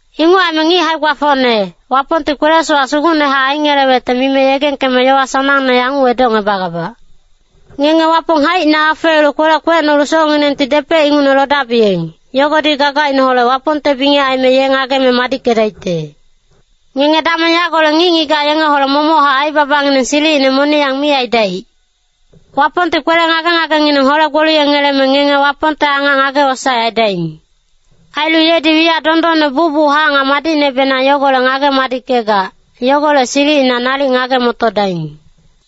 Inguc aime ngic hae-gbafocne, Wapongti kwele-sowac sugucnehac aingelewecte mibe yegengkeme yowa sanangne yanguc edocngebagabac. Ngenge Wapong haicina afeelu kwelec kwecnolu socnginengti depec ingucne lodabiyeng, yogodi gagaineholec Wapongte bingec aime ye ngageme madickedaicte. Ngenge dameng yagolec ngic-ngigac yengeholec momochac aibabangineng silicine moniyang mi aidaic. Wapongti kwele ngage-ngagengineng hole-gboliyengeleme ngenge Wapongte angac ngage-wosaec aidaing. Ailu yedi wiyac dondonne bucbuchac nga madicnebenang yogo ngageme madickegac, yogolec silicina nalic ngage-motodaing.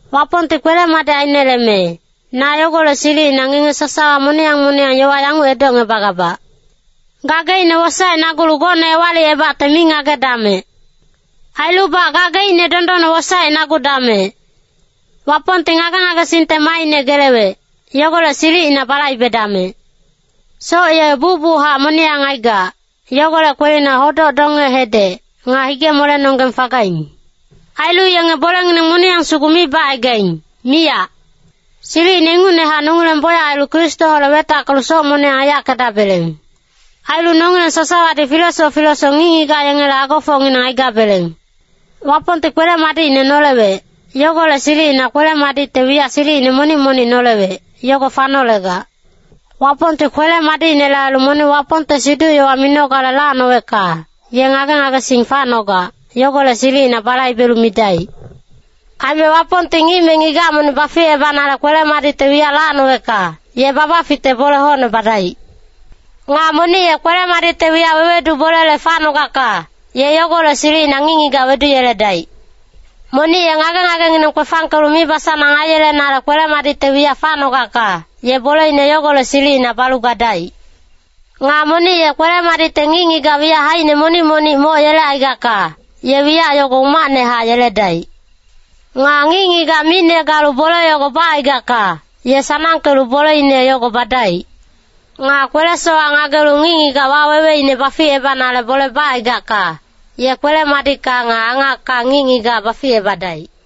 Wapongti kwele-madic aineleme, na yogolec silicina ngenge sasawa moniyang moniyang yowa yanguc edocngebagabac. Gageicne wosaecnagulu gocne ewalicebacte mi ngagedamec. Ailubac gageicne dondonne wosaecnagudamec. Wapongti ngage-ngagesingte maaine gelewec, yogolec silicina balaibedamec. Soc ye bucbuchac moniyang aigac, yogolec kwelina hodoc donge-hedec, nga hige-molenonggeng fagaing. Ailu yenge bolengineng moniyang sugu mi bacaigaing, miyac. Silicine ingucnehac nongileng bocyac ailu Kristoholec wetackelu soc moniyang aiyackegabeleng. Ailu nongileng sasawadi filesoc filesoc ngic-ngigac yengele agofocngineng aigabeleng. Wapongti kwele-madicine nolewec, yogolec silicina kwele-madicte wiyac silicine monic-monic nolewec, yogo fanolegac. Wapongti kwele-madicinele ailu monic Wapongte siduc-yowa minogale lacnowecka, ye ngage-ngagesing facnogac, yogolec silicina balaibelu midaic. Aime Wapongti ngic me ngigac monic baficebanale kwele-madicte wiyac lacnowecka, ye babaficte bole hocne badaic. Nga monic ye kwele-madicte wiyac wewedu bolele facnogacka, ye yogolec silicina ngic-ngigac weduyeledaic. Monic ye ngage-ngagengineng kwefangkelu mibasanang aiyelenale kwele-madicte wiyac facnogacka, ye boleine yogolec silicina balu gadaic. Nga monic ye kwele-madicte ngic-ngigac wiyac haicine monic-monic moc yelecaigacka, ye wiyac yogo umacnehac yeledaic. Nga ngic-ngigac micne galu bole yogo bacaigacka, ye sanangkelu boleine yogo badaic. Nga kwele-sowac ngagelu ngic-ngigac waweweine baficebanale bole bacaigacka, ye kwele-madicka nga angacka ngic-ngigac baficebadaic.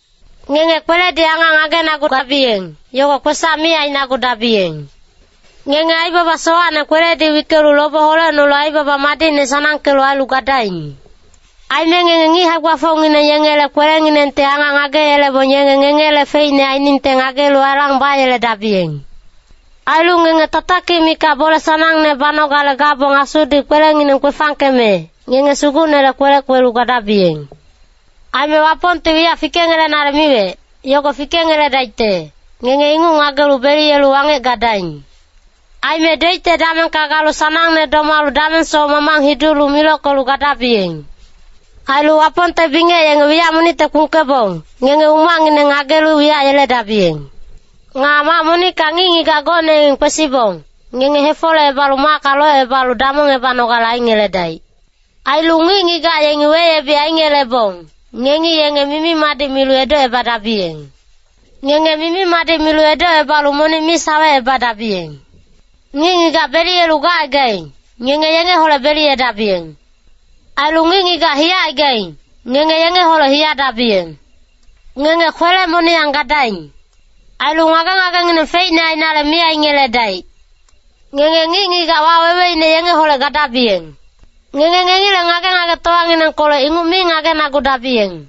Ngenge kweledi angac ngagenagugabiyeng, yogo kwesac mi ainagudabiyeng. Ngenge aibaba sowacne kweledi wickelu lobe holecnolu aibaba madicne sanangkelu ailu gadaing. Aime ngenge ngic hae-gbafocngineng yengele kwelenginengti angac ngageyelebong yenge ngengele feicne ainingte ngagelu alang bayeledabiyeng. Ailu ngenge tatakic mikac bole sanangne banogale gabong Asudi kwelengineng kwefangkeme, ngenge Sugucnele kwelec kwelu gadabiyeng. Aime Wapongti wiyac fikengelenale miwec, yogo fikengeledaicte, ngenge inguc ngagelu beliyelu wangec gadaing. Aime doicte damengka galu sanangne domalu damengsoc mamang hidulu milockelu gadabiyeng. Ailu Wapongte bingec yenge wiyac monicte kpungkebong, ngenge umacngineng ngagelu wiyac yeledabiyeng. Nga mac monickacni ngic-ngigac gocne yengi kwesibong, ngenge hefolecebalu macka locebalu damongebanogale aingeledaic. Ailu ngic-ngigac yengi weyebic aingelebong, ngengi yenge mimi-madic milu edocebadabiyeng! Ngenge mimi-madic milu edocebalu monic mi sawecebadabiyeng. Ngic-ngigac beliyelu gacaigaing, ngenge yengeholec beliyedabiyeng. Ailu ngic-ngigac hiyacaigaing, ngenge yengeholec hiyadabiyeng. Ngenge kwele-moniyang gadaing. Ailu ngage-ngagengineng feicne ainale mi aingeledaic. Ngenge ngic-ngigac waweweine yengeholec gadabiyeng. Ngenge ngengileng ngage-ngagetowanginengkolec inguc mi ngagenagudabiyeng.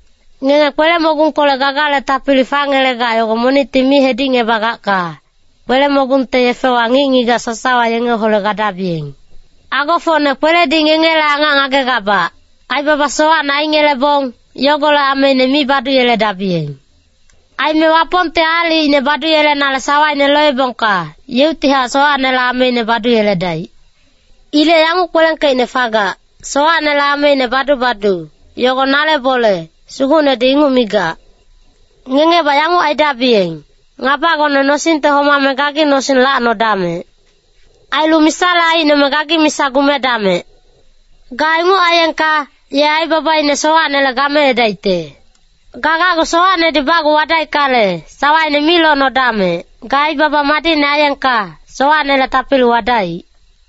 Ngenge kwele-mogungkolec gagale tapili fangelegac yogo monicti mi hedicngebagacka, kwele-mogungte yefewa ngic-ngigac sasawa yengeholec gadabiyeng. Agofocne kwelenedi ngengele angac ngagegabac, aibaba sowacne aingelebong, yogolec ameine mi baduyeledabiyeng. Aime Wapongti aalicine baduyelenale sawaine loebongka, yeuctihac sowacnele ameine baduyeledaic. Ilec yanguc kwelengkeicne fagac, “ ‘Sowacnele ameine badu-badu, yogo nale bole,’ Sugucnedi inguc migac.” Ngengebac yanguc aidabiyeng, “Ngabagone nosingte homame gagi nosing lacnodamec. Ailu misale aicnome gagi misa gumedamec. Ga inguc aiyengka, ye aibabaine sowacnele gameedaicte.” Ga gacgu sowacnedi bacgu wadaickale, sawaine mi locnodamec, ga aibaba madicne aiyengka, sowacnele tapili wadaic.